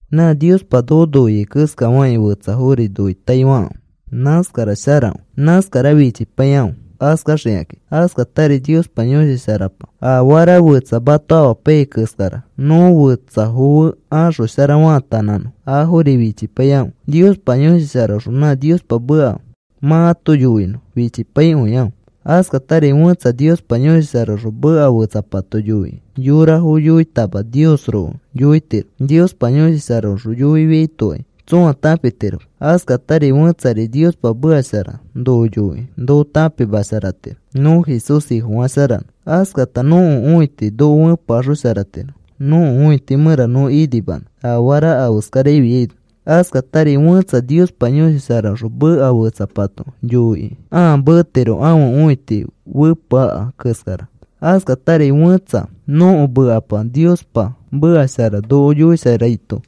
Nã Niospa noko noiai keskafakĩ fetsafori noitaifakãfe. Nãskara sharakõi. Nãskara fichipaikãfe askaxikakĩ. Askatari Niospa Yõshi Sharapa afara fetsa mato amapaiyai keskara nõ fetsafo fe axoshara faatanãnõ, afori fichipaikãfe. Niospa Yõshi Sharaõxõ nã Niospa meka mã ato yoinõ fichipaikõikãfe. Askatari fẽtsa Niospa Yõshi Sharaõxõ meka fetsapato yoikĩ yorafo yoitama Niosroko yoitiro. Niospa Yõshi Sharaõxõ yoifiaitokai tsõa tãpitiroma. Askatari fẽtsari Niospa meka shara noko yoikĩ noko tãpimasharatiro nõ Jesús Ifofasharanõ. Askata nõko õiti noko fepeaxosharatiro nõko õiti mẽra nõ inimanõ afara afeskarafiaino. Askatari fẽtsa Niospa Yõshi Sharaõxõ meka fetsapato yoikĩ ãa metiro ãfe õiti fepeaka keskara. Askatari fẽtsa nõko mekapa Niospa meka shara noko yoisharaito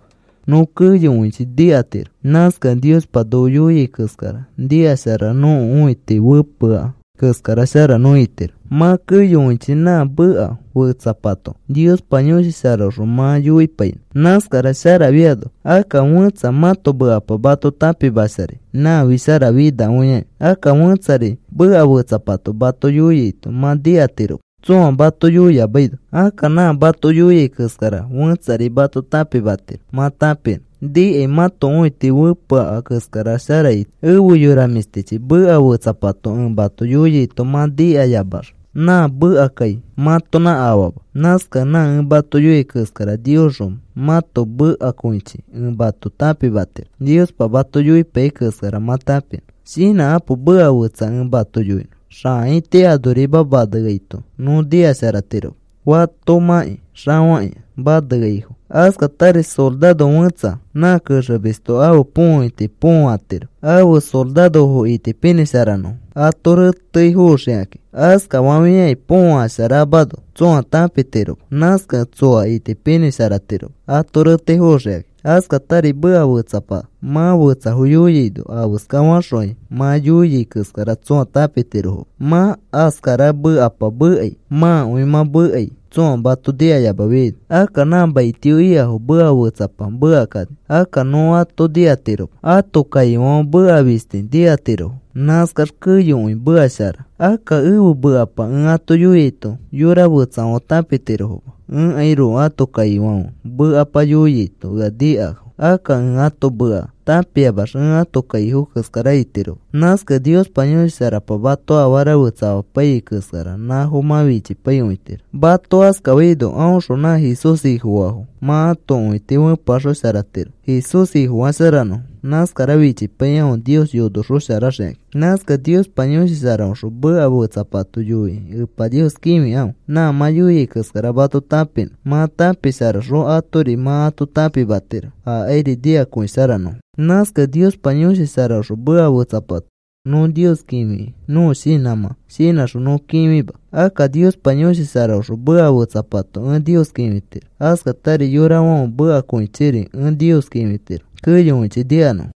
nõ keyokõichi nikatiro. Nãskakẽ Niospa noko yoiai keskara nikasharax nõko õiti fepeaka keskara shara nõ itiro. Mã keyokõichi nã meka fetsapato Niospa Yõshi Sharaõxõ mã yoipainõ. Nãskara sharafiano akka fẽtsa mãto mekapa mato tãpimasharai nãfi sharafinakõiaki. Akka fẽtsari meka fetsapato mato yoiaito mã nikatiroma tsõa mato yoiyamaino. Akka nã mato yoiai keskara fẽtsari mato tãpimatiro mã tãpinõ. Nikai mãto õiti fepeaka keskara shara itiro. Efe yora mĩshtichi, meka fetsapato ẽ mato yoiaito mã nikayamax nã mekakai mãtonã afama. Nãskakẽ nã ẽ mato yoiai keskara Niosxõ mãto mekakõichi ẽ mato tãpimatiro Niospa mato yoipaiyai keskara mã tãpinõ. Shinãkãpo, meka fetsa ẽ mato yoinõ. Xãiti anorima maneaito nõ nikasharatiroma fatomãkĩ xafakĩa maneaifo. Askatari soraro fẽtsa nã kexemisto ãfe põõiti põõatiro ãfe sorarofo itipinĩsharanõfo ato reteifoxikakĩ. Askafafiakĩ põõasharamano tsõa tãpitiroma. Nãskakẽ tsoa itipinĩsharatiroma ato reteifoxikakĩ. Askatari meka fetsapa mã fetsafo yoiaino afeska faxõkai mã yoiai keskara tsõa tãpitirofoma. Mã askara mekapa mekai mãakõi mã mekai tsõa mato nikayamafiaino. Akka nã maitio ikafo meka fetsapa mekakani. Akka nõ ato nikatiroma. Ãto kaifãfe meka fisti nikatirofo. Nãskax keyokõi meka shara. Akka ẽfe mekapa ẽ ato yoiaito yora fetsafãfe tãpitirofoma. Ẽkairoko ãto kaifãfe mekapa yoiaito ea nikafo. Akka ẽ ãto meka tãpiamax ẽ ãto kaifo keskara itiroma. Nãskakẽ Niospa Yõshi Sharapa mato afara fetsa amapaiyai keskara nãfo mã fichipaikõitiro. Mato askafaino aõxõ nã Jesús Ifofaafo mã ato õiti fepeaxosharakõitiro Jesús Ifofasharanõfo. Nãskara fichipaikãfe Nios yonosharaxoxikakĩ. Nãskakẽ Niospa Yõshi Sharaõxõ meka fetsapato yoikĩ Epa Nios kĩfikãfe nã mã yoiai keskara mato tãpimanõ. Mã tãpisharaxõ atori mã ato tãpimatiro akairi nikakõisharanõfo. Nãskakẽ Niospa Yõshi Sharaõxõ meka fetsapato nõ Nios kĩfikĩ nõko shinãmã shinãxõ nõ kĩfima. Akka Niospa Yõshi Sharaõxõ meka fetsapato ẽ Nios kĩfitiro. Askatari yorafãfe mekakõichiri ẽ Nios kĩfitiro keyokõichi nikanõfo.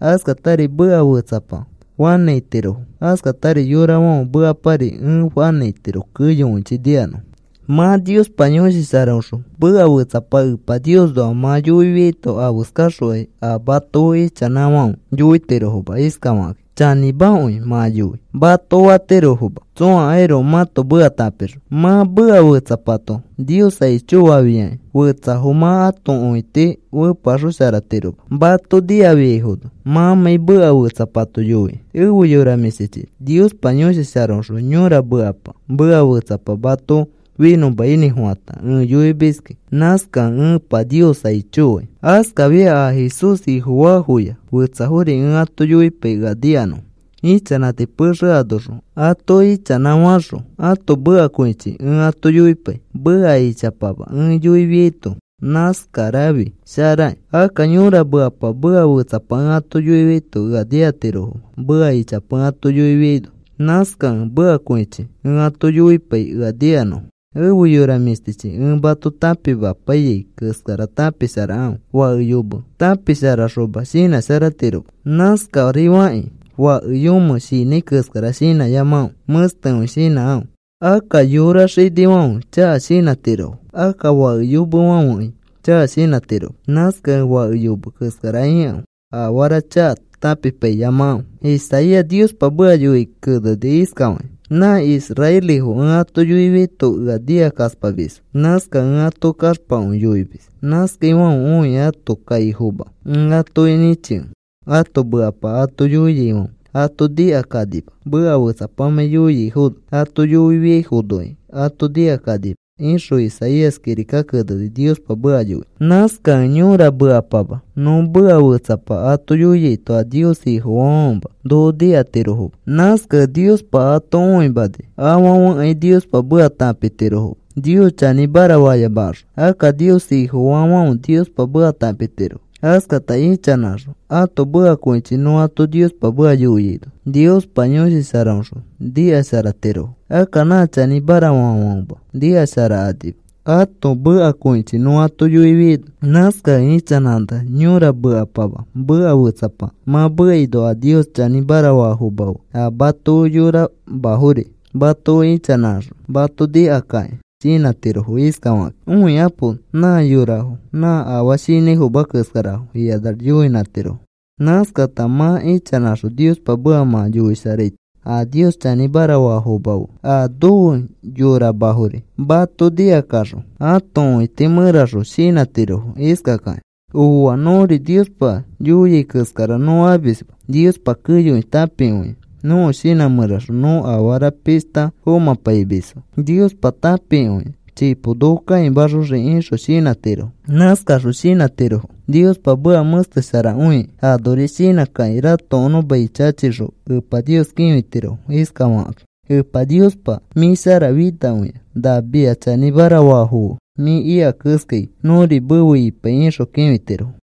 Askatari meka fetsapa fanãitiro. Askatari yorafãfe mekapari ẽ fanãitiro keyokõichi nikanõfo. Mã Niospa Yõshi Sharaõxõ meka fetsapa Epa Niosnoa mã yoifiaito afeskaxokai a mato fe ichanãfãfe yoitirofoma iskafakakĩ: “Chanĩmakõi mã yoi,” mato fatirofoma tsõakairoko mãto meka tãpixõ. Mã meka fetsapato Nios aicho fafiakĩ fetsafo mã ato õiti fepeaxosharatiroma mato nikafiaifono mãmãi meka fetsapato yoikĩ. Efe yora mĩshtichi, Niospa Yõshi Sharaõxõ yõra mekapama meka fetsapa mato finõinĩfofãta ẽ yoimiskĩ. Nãskakẽ ẽ Epa Nios aicho fai. Askafia a Jesús Ifofaafoya fetsafori ẽ ãto yoipai ea nikanõfo. Ichanãti pexe anoxõ ato ichanãfaxõ ãto mekakõichi ẽ ato yoipai meka ichapama ẽ yoifiaito. Nãskarafi sharakĩ. Akka yõra mekapama meka fetsapa ẽ ato yoiaito ea nikatirofoma meka ichapa ẽ ato yoifiaito. Nãskakẽ mekakõichi ẽ ato yoipai ea nikanõfo. Efe yora mĩshtichi, ẽ mato tãpimapaiyai keskara tãpisharakãfe. Fake yomẽ tãpisharayoxoma, shinãsharatiroma. Nãskarifakĩ fake yomẽ shinãi keskara shinãyamakãfe. Mẽstekõi shinãkãfe. Akka yora xinifãfe chaka shinãtirofo. Akka fake yomefãfekai chaka shinãtiroma. Nãskakẽ fake yome keskara ikãfe. Afara chaka tãpipaiyamakãfe. Isaías Niospa meka yoikĩ keneni iskafakĩ: Nã israelifo ẽ ato yoifiaito ea nikakaspamisfo. Nãskakẽ ẽ ato kaxpakõi yoimis. Nãskaifãfe õikĩ ãto kaifoma ẽ atoki nĩchikẽ, ãto mekapa ato yoiaifãfe ato nikakanima meka fẽtsapamãi yoiafono. Ato yoifiaifonokai ato nikakanima, ixõ Isaías kirika keneni Niospa meka yoikĩ. Nãskakẽ yõra mekapama nõ meka fetsapa ato yoiaito a Nios Ifofaafãfema noko nikatirofoma. Nãskakẽ Niospa ato õimani afãfekai Niospa meka tãpitirofoma Nios chanĩmara fayamakaxõ. Akka Nios Ifofaafãfe Niospa meka tãpitirofo. Askata ichanãxõ ãto mekakõichi nõ ato Niospa meka yoiaino Niospa Yõshi Sharaõxõ nikasharatirofo. Akka nã chanĩmara faafãfema nikasharakanima ãto mekakõichi nõ ato yoifiaino. Nãskakẽ ichanãx yõra mekapama meka fetsapa mã mekaino a Nios chanĩmara faafoma fe a mato fe yoramafori mato fe ichanãxõ mato nikakakĩ shinãtirofo iskafakakĩ: “Õikapo, nã yorafo nã afaa shinãifoma keskarafo,” ikanax yoinãtirofo. Nãskata mã ichanãxõ Niospa meka mã yoisharaito a Nios chanĩmara faafoma fe a nofe yoramafori mato nikakaxõ ãto õiti mẽraxõ shinãtirofo iskakakĩ: “Ooa, nõri Niospa yoiai keskara nõ amisma. Niospa keyokõi tãpikõia. Nõko shinã mẽraxõ nõ afara pishta fomãpaimisfo Niospa tãpikõia. Chipo noko kãimaxoxii,” ixõ shinãtirofo. Nãskaxõ shinãtirofo Niospa meka mẽstesharakõikĩ. Anori shinãkakĩ ratokonõ mai chachixõ Epa Nios kĩfitirofo iskafakakĩ: “Epa Niospa, mĩ sharafinakõia. Na mia chanĩmara faafo fe mĩ ika keskai nõri mefe ipai,” ixõ kĩfitirofo.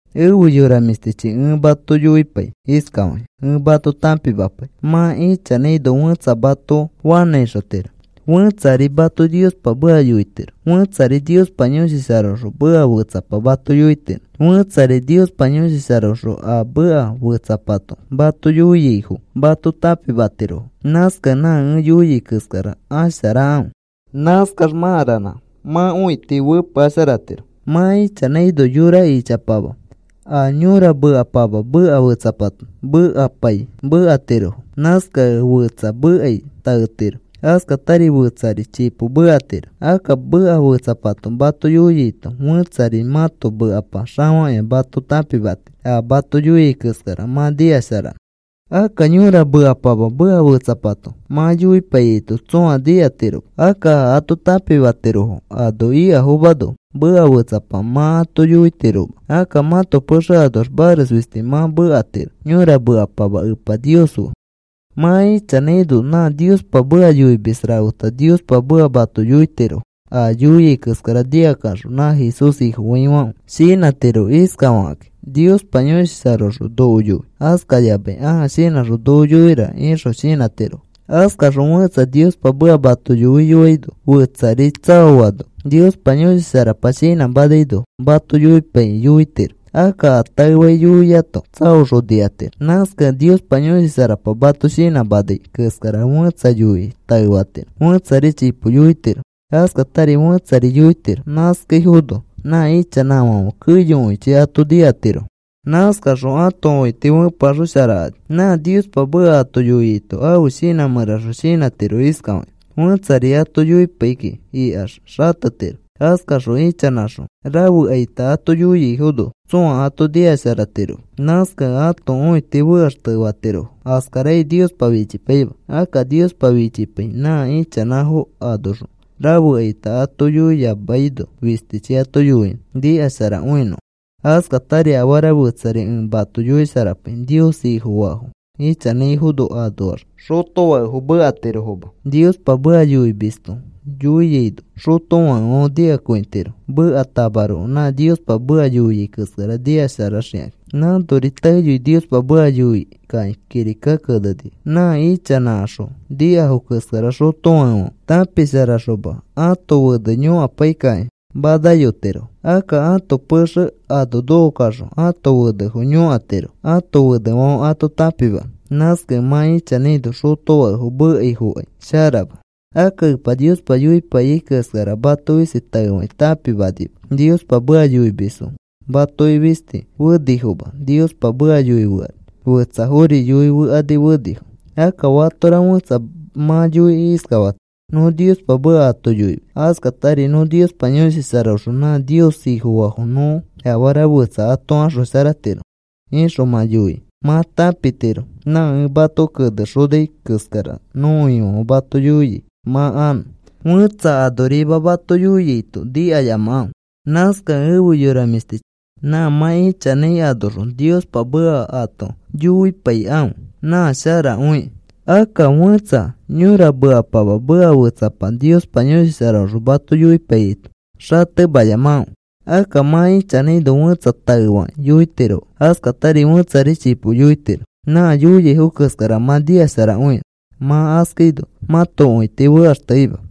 Efe yora mĩshtichi, ẽ mato yoipai iskafakĩ ẽ mato tãpimapai. Mã ichanãino fẽtsa mato fanãixotiro. Fẽtsari mato Niospa meka yoitiro. Fẽtsari Niospa Yõshi Sharaõxõ meka fetsapa mato yoitiro. Fẽtsari Niospa Yõshi Sharaõxõ a meka fetsapato mato yoiaifo mato tãpimatirofo. Nãskakẽ nã ẽ yoiai keskara asharakãfe. Nãskax mã ranã mã õiti fepeasharatiro. Mã ichanãino yora ichapama a yõra mekapama meka fetsapa mekapai mekatirofo. Nãskakẽ fetsa mekai taetiro. Askatari fetsari chipo mekatiro. Akka meka fetsapato mato yoiaito fẽtsari mãto mekapa xafakĩa mato tãpimatiro a mato yoiai keskara mã nikasharanõ. Akka yõra mekapama meka fetsapato mã yoipaiyaito tsõa nikatiroma. Akka a ato tãpimatirofo ano ikafomano meka fetsapa mã ato yoitiroma. Akka mãto pexe anoax mares fisti mã mekatiro yõra mekapama Epa Nios fe. Mã ichanãino nã Niospa meka yoimis rafeta Niospa meka mato yoitirofo. A yoiai keskara nikakaxõ nã Jesús Ifofaifãfe shinãtiro iskafakakĩ: “Niospa Yõshi Sharaõxõ noko yoi,” askayamai, “Ãa shinãxõ noko yoira,” ixõ shinãtirofo. Askaxõ fẽtsa Niospa meka mato yoiyoaino fetsari tsaoano Niospa Yõshi Sharapa shinãmanaino mato yoipaikĩ yoitiro. Akka a taefakĩ yoiato tsaoxõ nikatiro. Nãskakẽ Niospa Yõshi Sharapa mato shinãmanai keskara fẽtsa yoikĩ taefatiro fẽtsari chipo yoitiro. Askatari fẽtsari yoitiro. Nãskaifono nã ichanãfãfe keyokõichi ato nikatirofo. Nãskaxõ ato õiti fepeaxosharakani. Nã Niospa meka ato yoiaito ãfe shinã mẽraxõ shinãtiro iskafakĩ: “Fẽtsari ato yoipai kiki ikax xatetiro.” Askaxõ ichanãxõ rafekaita ato yoiaifono tsõa ato nikasharatiroma. Nãskakẽ ãto õiti fekaxtefatirofo. Askarakai Niospa fichipaima. Akka Niospa fichipai nã ichanãfo anoxõ rafekaita ato yoiyamaino fistichi ato yoinõ nikasharakõinõfo. Askatari afara fetsari ẽ mato yoisharapai. Nios Ifofaafo ichanãifo anoax xotofakefo mekatirofoma. Niospa meka yoimisto yoiaino xotofakefãfe nikakõitirofo. Mekatamaroko nã Niospa meka yoiai keskara nikasharaxikakĩ. Nãnori taeyoi Niospa meka yoikakĩ kirikaki kenenifo. Nã ichanãkaxõ nikafo keskara xotofakefãfe tãpisharaxoma ãto fene yõkapaikakĩ manayotirofo. Akka ãto pexe ano nokokaxõ ãto fenefo yõkatirofo ãto fenefãfe ato tãpimanõ. Nãskakẽ mã ichanãino xotofakefo mekaifokai sharama. Akka Epa Niospa yoipaiyai keskara mato fisti taefakĩ tãpimanima. Niospa meka yoimisfo matoki fisti fenifoma Niospa meka yoifekani. Fetsafori yoifekani fenifo. Akka fatora fẽtsa mã yoikĩ iskafatiro: “Nõ Niospa meka ato yoimis. Askatari nõ Niospa Yõshi Sharaõxõ nã Nios Ifofaafo nõ afara fetsa ato axosharatiro,” ixõ mã yoikĩ mã tãpitiro nã ẽ mato kenexonai keskara nõko Ifãfe mato yoia mã anõ. Fẽtsa anorima mato yoiaito nikayamakãfe. Nãskakẽ efe yora mĩshtichi, nã mã ichanãi anoxõ Niospa meka ato yoipaikãfe. Nã sharakõikĩ. Akka fẽtsa yõra mekapama meka fetsapa Niospa Yõshi Sharaõxõ mato yoipaiyaito xatemayamakãfe. Akka mã ichanãino fẽtsa taefakĩ yoitiro. Askatari fẽtsari chipo yoitiro nã yoiaifo keskara mã nikasharakõinõ. Mã askaino mãto õiti fekaxteima.